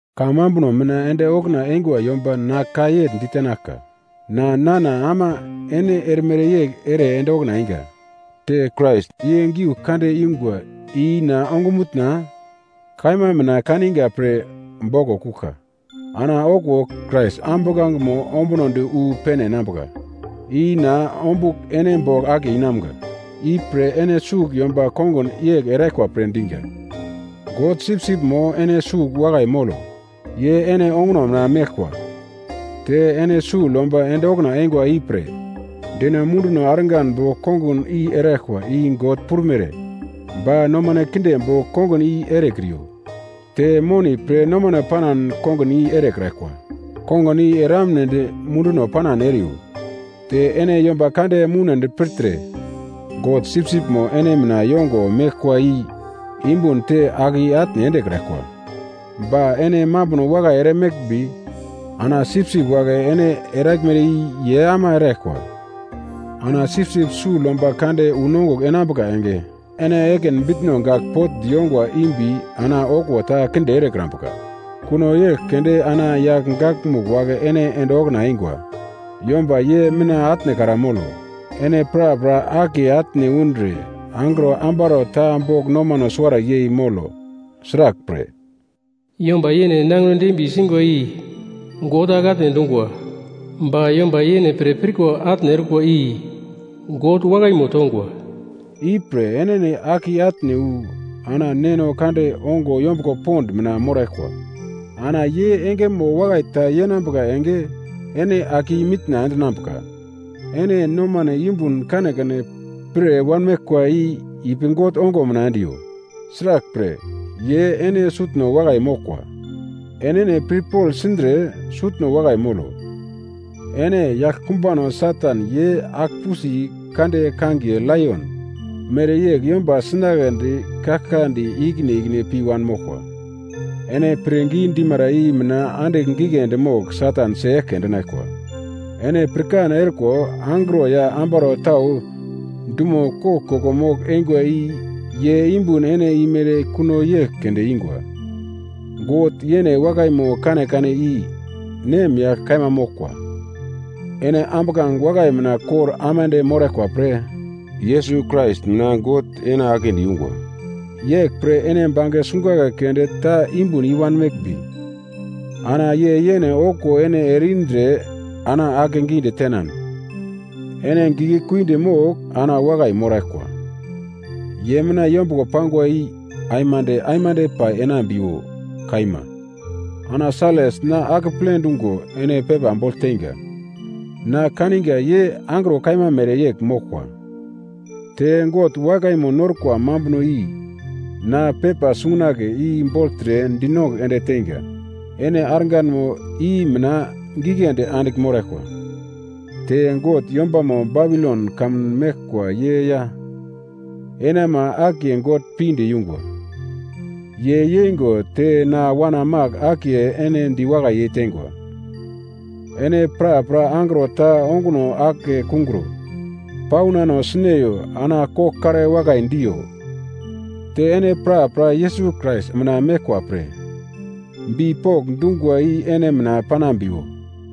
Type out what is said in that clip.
Kamambuno mina ende okuna eingwa yomba na ka yegl ditenaglka. Na nana ama ene erimere yegl ere ende okuna einga. Te Krais ye giu kande ingwa ina ongumutna kaima mina kaniga pre boglo kuglka, ana okuwo Krais ambuglangemo ombunodi wu pene enambuka i na ombugl ene bogl akiye inamga. Ipre ene sugl yomba kongun yegl eraglkwa pre diga. God sipsipmo ene sugl wakai molo. Ye ene onguno mina meglkwa. Te ene sugl yomba ende okuna eingwa ipre deno munduno argan bogl kongun i eraglkwa i God prumere, ba nomane kinde bogl kongun i erekriyo. Te moni pre nomano panan kongun i erekraglkwa, kongun i eramnedi munduno panan eriyo. Te ene yomba kande moune dipirtre, God sipsipmo ene mina yongo meglkwa i yumbun te ake i-atne endekraglkwa, ba ene mambuno wakai eremeglmbi ana sipsip wagle ene eraglmere i ye ama eraglkwa. Ana Sipsip Sugl Yomba Kande unongugl enambuka enge, ene ekin bitno gagl potndi yongwa imbi ana okuwo ta kinde erekrambuka. Kuno yegl keunde ana yagl gakmugl wagle ene ende okuna eingwa yomba ye mina atnekra molo. Ene prapra akiye atne undre angro ambaro ta bogl nomano suwara yei molo. Sraglpre, “Yomba yene nangino dembiye singwa i God ake atne endungwa, ba yomba yene pre pirko atne orkwa i God wakaimo tongwa.” Ipre enene ake i-atne wu ana Neno kande ongo yombuglo pond mina moraglkwa. Ana ye engemo wakai ta yenambuka enge ene ake i-mitna endinambuka. Ene nomane yumbun kanekane pir wanmeglkwa i ipi God ongo mina endiyo. Sraglpre, ye ene sutno wakai moglkwa. Enene pirpogl sindre sutno wakai molo. Ene yaglkumbano Satan ye agl-pusi kande kangiye laion mereyegl yomba sinagledi kaglkadi ikine ikine pi wanmoglkwa. Ene pirngi dimara i mina andigl giglendi mogl Satan si-eglke endinaglkwa. Ene pirkan erikwa, angro ya ambaro tau dumo koglkoglo mogl-eingwa i ye yumbun ene imere kuno yegl keunde ingwa. God yene wakaimo kanekane i nemyagl kaima moglkwa. Ene ambuglange wakai mina kor aimande moraglkwa pre Yesus Krais mina God ene aglendi yungwa. Yeglpre ene bange sungunagle keunde ta yumbun i-wanmeglmbi, ana ye yene okuwo ene ere indre ana akegidi tenan ene giglekuidi mogl ana wakai moraglkwa. Ye mina yombuglo pangwa i aimande aimande pai enambiwo. Kaima. Ana Sailas na akeple dungo ene pepa bogl teinga. Na kaniga ye angro kaima mereyegl moglkwa. Te God wakaimo norkwa mambuno i na pepa sungunagle i bogltre dinongugl ende teinga, ene arganmo i mina giglendi andigl moraglkwa, te God yombama Babilon kamun meglkwa ye ya ene ama akiye God pinde yungwa. Ye yeingo te na wana Mak akiye ene diwakai yeitengwa. Ene prapra angro ta onguno ake kungro paunano sineyo ana koglkare wakai diyo. Te ene prapra Yesus Krais mina meglkwa pre bipok dungwa i ene mina panambiwo.